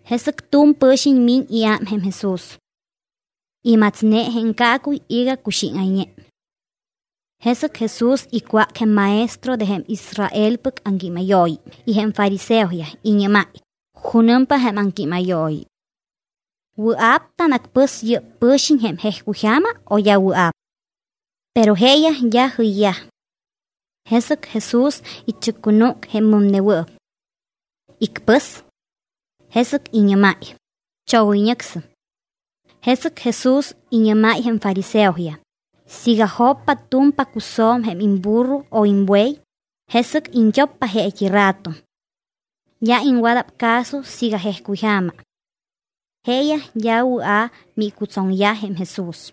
Jesɨc tu̱m pɨ̱xiñ miñ iám jém Jesús. Imatsne jém caacuy iga cuxíŋayñe. Jesɨc Jesús icwác jém maestro de jém Israelpɨc aŋquímayooyi y jém fariseoyaj, iñɨ́máy: —¿Junɨmpa jém aŋquímayooyi? ¿Wɨa̱p tanacpɨs yɨ́p pɨ̱xiñ jém jejcuyja̱ma o d́a wɨa̱p? Pero jeeyaj d́a jɨyyaj. Jesɨc Jesús ichɨccunúc jém mɨmnewɨɨp. Icpɨs. Jesɨc iñɨ́máy: —Chogoyñɨcsɨm. Jesɨc Jesús iñɨ́máy jém fariseoyaj: —Siiga joppa tu̱m pacusjo̱m jém imburro o imbuey, jesɨc iñt́oppa jeet́i rato. D́a iŋwada̱p caso siiga jejcuyja̱ma. Jeeyaj d́a wɨa̱ miicutsoŋyaj jém Jesús.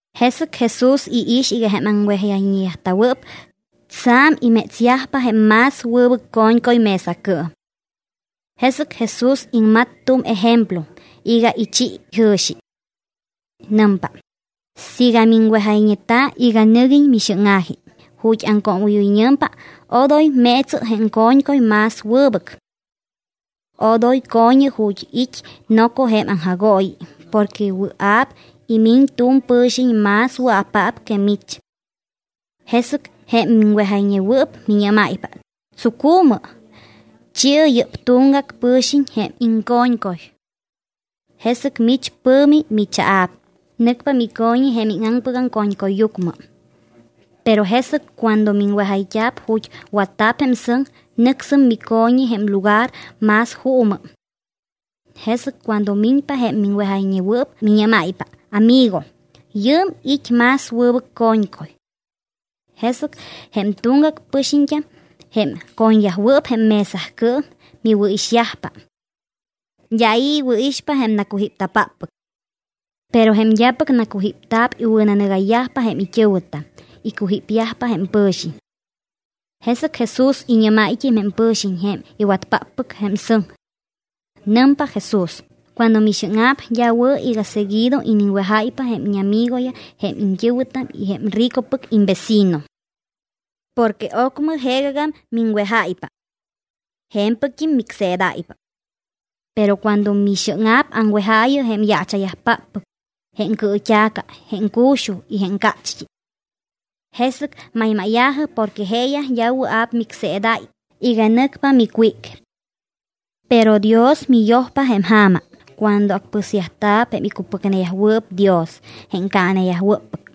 Jesɨc Jesús iix iga jém aŋwejayñeta̱wɨɨp tsa̱m imétsyajpa jém más wɨbɨc co̱ñcuy mesacɨɨm. Jesɨc Jesús iŋmat tu̱m ejemplo iga ichi jɨ̱xi. Nɨmpa: —Siiga miŋwejayñeta̱ iga nɨguiñ mixɨ́ŋa̱ji ju̱t́ aŋcoomɨ́yoyñɨ̱mpa, odoy meetsɨ jém co̱ñcuy más wɨbɨc. Odoy co̱ñɨ ju̱t́ it́ noco jém aŋjagooyi porque wɨa̱p imiñ tu̱m pɨ̱xiñ más wɨa̱paap que mich. Jesɨc jém miŋwejayñewɨɨp miñɨ́máypa: “¡Tsucu̱mɨ! Chi̱ɨ yɨ́p tuŋgac pɨ̱xiñ jém iŋco̱ñcuy.” Jesɨc mich pɨ̱mi michaa̱p, nɨcpa mico̱ñi jém íŋaŋpɨgam co̱ñcuyyucmɨ. Pero jesɨc cuando miŋwejayt́a̱p ju̱t́ watta̱p jém sɨŋ, nɨcsɨm mico̱ñi jém lugar más juumɨ. Jesɨc cuando miñpa jém miŋwejayñewɨɨp, miñɨ́máypa: “Amigo, yɨɨm it́ más wɨbɨc co̱ñcuy.” Jesɨc jém tuŋgac pɨxiñt́am jém co̱ñyajwɨɨp jém mesacɨɨm miwɨ̱ixyajpa. D́a i̱ iwɨ̱ixpa jém nacujípta̱páppɨc. Pero jém d́apɨc nacujípta̱p, iwɨ̱nanɨgayyajpa jém it́ɨ̱wɨtam, icujípyajpa jém pɨ̱xiñ. Jesɨc Jesús iñɨ́máyt́im jém pɨ̱xiñ jém iwatpáppɨc jém sɨŋ. Nɨmpa Jesús: —Cuando mixɨ́ŋa̱p, d́a wɨ̱ iga seguido iniŋwejáypa jém íñamigoyaj, jém iñt́ɨ̱wɨtam y jém ricopɨc imvecino. Porque ocmɨ jeegagam miŋwejáypa. Je̱mpɨct́im micseedáypa. Pero cuando mixɨ́ŋa̱p, aŋwejaayɨ jém yaacha̱yajpáppɨc, jém cɨɨt́a̱ca, jém cu̱xuj y jém cácht́i. Jesɨc maymáya̱jɨ porque jeeyaj d́a wɨa̱p micseedáy iga nɨcpa micwíc. Pero Dios miyojpa jém ja̱ma cuando acpɨsyajta̱p jém icupɨcneyajwɨɨp Dios jém caaneyajwɨ́ppɨc.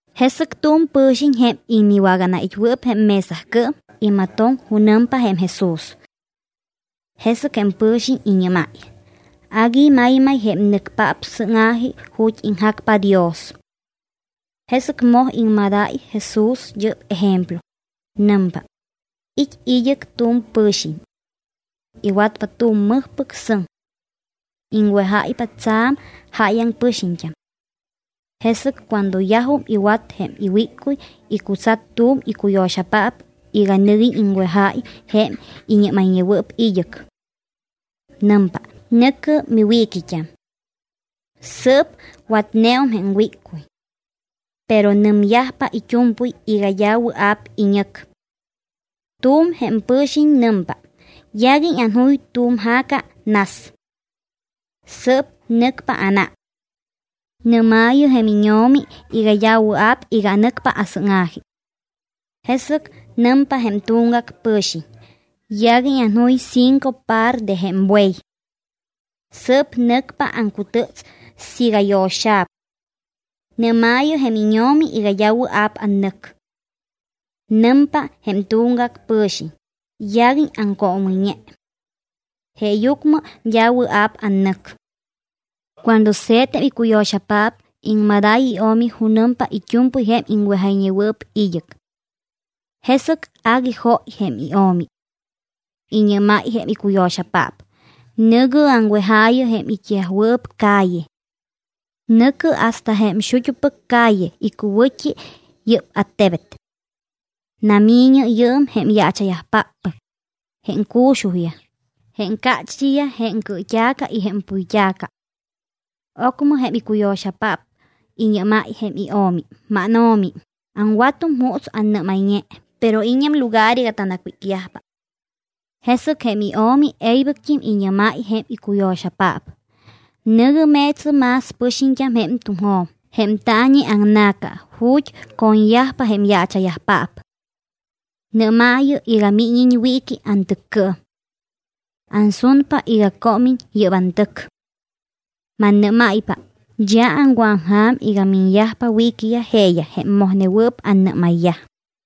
Jesɨc tu̱m pɨ̱xiñ, jém iwaganait́wɨɨp jém mesacɨɨm, imatoŋ junɨmpa jém Jesús. Jesɨc jém pɨ̱xiñ iñɨ́máy: —Agui maymayyaj jém nɨcpaap sɨ́ŋa̱ji ju̱t́ iŋjacpa Dios. Jesɨc moj iŋmadáy Jesús yɨ́p ejemplo. Nɨmpa: —It́ id́ɨc tu̱m pɨ̱xiñ. Iwatpa tu̱m mɨjpɨc sɨŋ. Iŋwejáypa tsa̱m jáyaŋ pɨxiñt́am. Jesɨc cuando yajum iwat jém wíccuy, icutsat tu̱m icuyo̱xapaap iga nɨguiñ iŋwejáy jém iñɨ́mayñewɨɨp id́ɨc. Nɨmpa: “Nɨ̱cɨ miwiiquit́am. Sɨɨp watneum jém wíccuy.” Pero nɨmyajpa it́u̱mpɨy iga d́a wɨa̱p iñɨc. Tu̱m jém pɨ̱xiñ nɨmpa: “Yaguiñ anjuy tu̱m ja̱ca nas. Sɨɨp nɨcpa ánám. Nɨ́maayɨ jém íño̱mi iga d́a wɨa̱p iga nɨcpa asɨ́ŋa̱ji.” Jesɨc nɨmpa jém tuŋgac pɨ̱xiñ: “Yaguiñ anjuy cinco par de jém buey. Sɨɨp nɨcpa aŋcutɨts siiga yo̱xa̱p. Nɨ́maayɨ jém íño̱mi iga d́a wɨa̱p annɨc.” Nɨmpa jém tuŋgac pɨ̱xiñ: “Yaguiñ aŋcoomɨyñe. Jeeyucmɨ d́a wɨa̱p annɨc.” Cuando se̱t jém icuyo̱xapaap, iŋmadáy io̱mi junɨmpa it́u̱mpɨy jém iñɨ́mayñewɨɨp id́ɨc. Jesɨc agui jóy jém io̱mi. Iñɨ́máy jém icuyo̱xapaap: “Nɨ̱gɨ aŋwejaayɨ jém it́yajwɨɨp calle. Nɨ̱cɨ hasta jém xut́upɨc calle icuwɨ̱t́i yɨ́p attebet. Nami̱ñɨ yɨɨm jém yaacha̱yajpáppɨc, jém cu̱xujyaj, jém cácht́iyaj, jém cɨɨt́a̱ca y jém puyt́a̱ca.” Ocmɨ jém icuyo̱xapaap iñɨ́máy jém io̱mi: “Máno̱mi, aŋwatum juuts annɨ́mayñe, pero it́ñam lugar iga tanacwícyajpa.” Jesɨc jém io̱mi e̱ybɨct́im iñɨ́máy jém icuyo̱xapaap: “Nɨ̱gɨ meetsɨ más pɨxiñt́am jém tuŋjo̱m y jém taañi aŋna̱ca ju̱t́ co̱ñyajpa jém yaacha̱yajpaap. Nɨ́maayɨ iga míñiñ wiiqui antɨccɨɨm. Ansunpa iga cómiñ yɨ́p antɨc. Mannɨ́máypa, d́a aŋwɨ̱aŋja̱m iga miñyajpa wiiqui jeeyaj jém mojnewɨɨp annɨ́mayyaj.”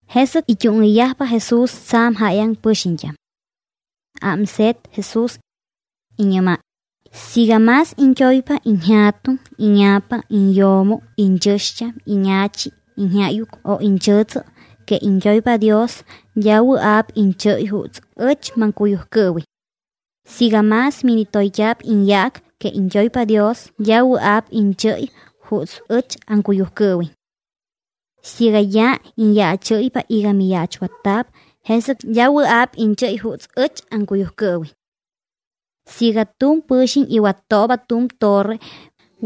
Jesɨc it́úŋɨyyajpa Jesús tsa̱m jáyaŋ pɨxiñt́am. Ámse̱t Jesús. Iñɨ́máy: —Siiga más iñt́oypa iñja̱tuŋ, íña̱pa, iñyo̱mo, iñchɨ̱xt́am, íña̱chi, iñjáyuc o iñchɨ̱tsɨ que iñt́oypa Dios, d́a wɨa̱p iñchɨ́y juuts ɨch maŋcuyujcɨɨwiñ. Siiga más minitoyt́a̱p iñyaac que iñt́oypa Dios, d́a wɨa̱p iñchɨ́y juuts ɨch aŋcuyujcɨɨwiñ. Siiga d́a iñyaachɨ́ypa iga miyaachwatta̱p, jesɨc d́a wɨa̱p iñchɨ́y juuts ɨch aŋcuyujcɨɨwiñ. Siiga tu̱m pɨ̱xiñ iwattooba tu̱m torre,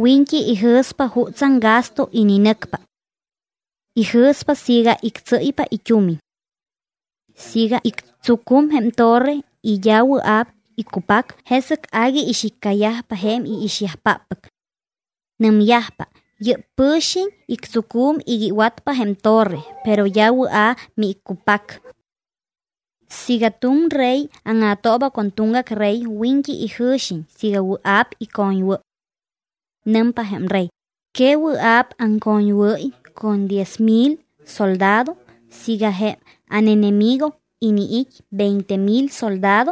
wiñt́i ijɨ̱spa jutsaŋ gasto ininɨcpa. Ijɨ̱spa siiga ictsɨ́ypa it́umiñ. Siiga ictsucum jém torre y d́a wɨa̱p iccupac, jesɨc agui ixiccayajpa jém iixyajpáppɨc. Nɨmyajpa: “Yɨ́p pɨ̱xiñ ictsucum iga iwatpa jém torre, pero d́a wɨa̱ miiccupac.” Siiga tu̱m rey áŋa̱tooba con tuŋgac rey, wiñt́i ijɨ̱xiñ siiga wɨa̱p icoñwɨ́y. Nɨmpa jém rey: “¿Que wɨa̱p aŋcoñwɨ́y con jém diez mil soldado siiga jém ánenemigo iniit́ veinte mil soldado?”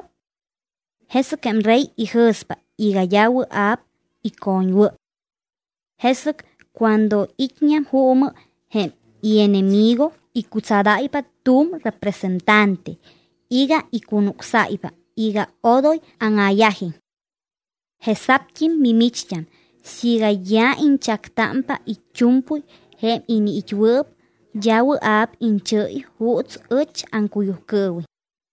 Jesɨc jém rey ijɨ̱spa iga d́a wɨa̱p icoñwɨ́y. Jesɨc cuando it́ñam juumɨ jém ienemigo, icutsadáypa tu̱m representante iga icunucsáypa iga odoy áŋa̱yajiñ. Jesa̱pt́im mimicht́am, siiga d́a iñchactámpa it́u̱mpɨy jém iniit́wɨɨp, d́a wɨa̱p iñchɨ́y juuts ɨch aŋcuyujcɨɨwiñ.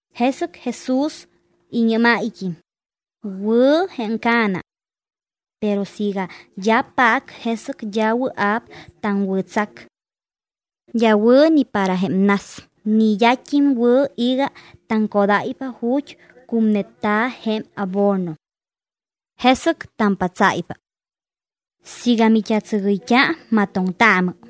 Jesɨc Jesús iñɨ́máyt́im: —Wɨ̱ jém ca̱na. Pero siiga d́a paac, jesɨc d́a wɨa̱p taŋwɨ̱tsac. D́a wɨ̱ ni para jém nas, ni d́at́im wɨ̱ iga taŋcodáypa ju̱t́ cu̱mneta̱ jém abono. Jesɨc tampatsáypa. Siiga mit́atsɨgɨyt́a, amatoŋtaamɨ.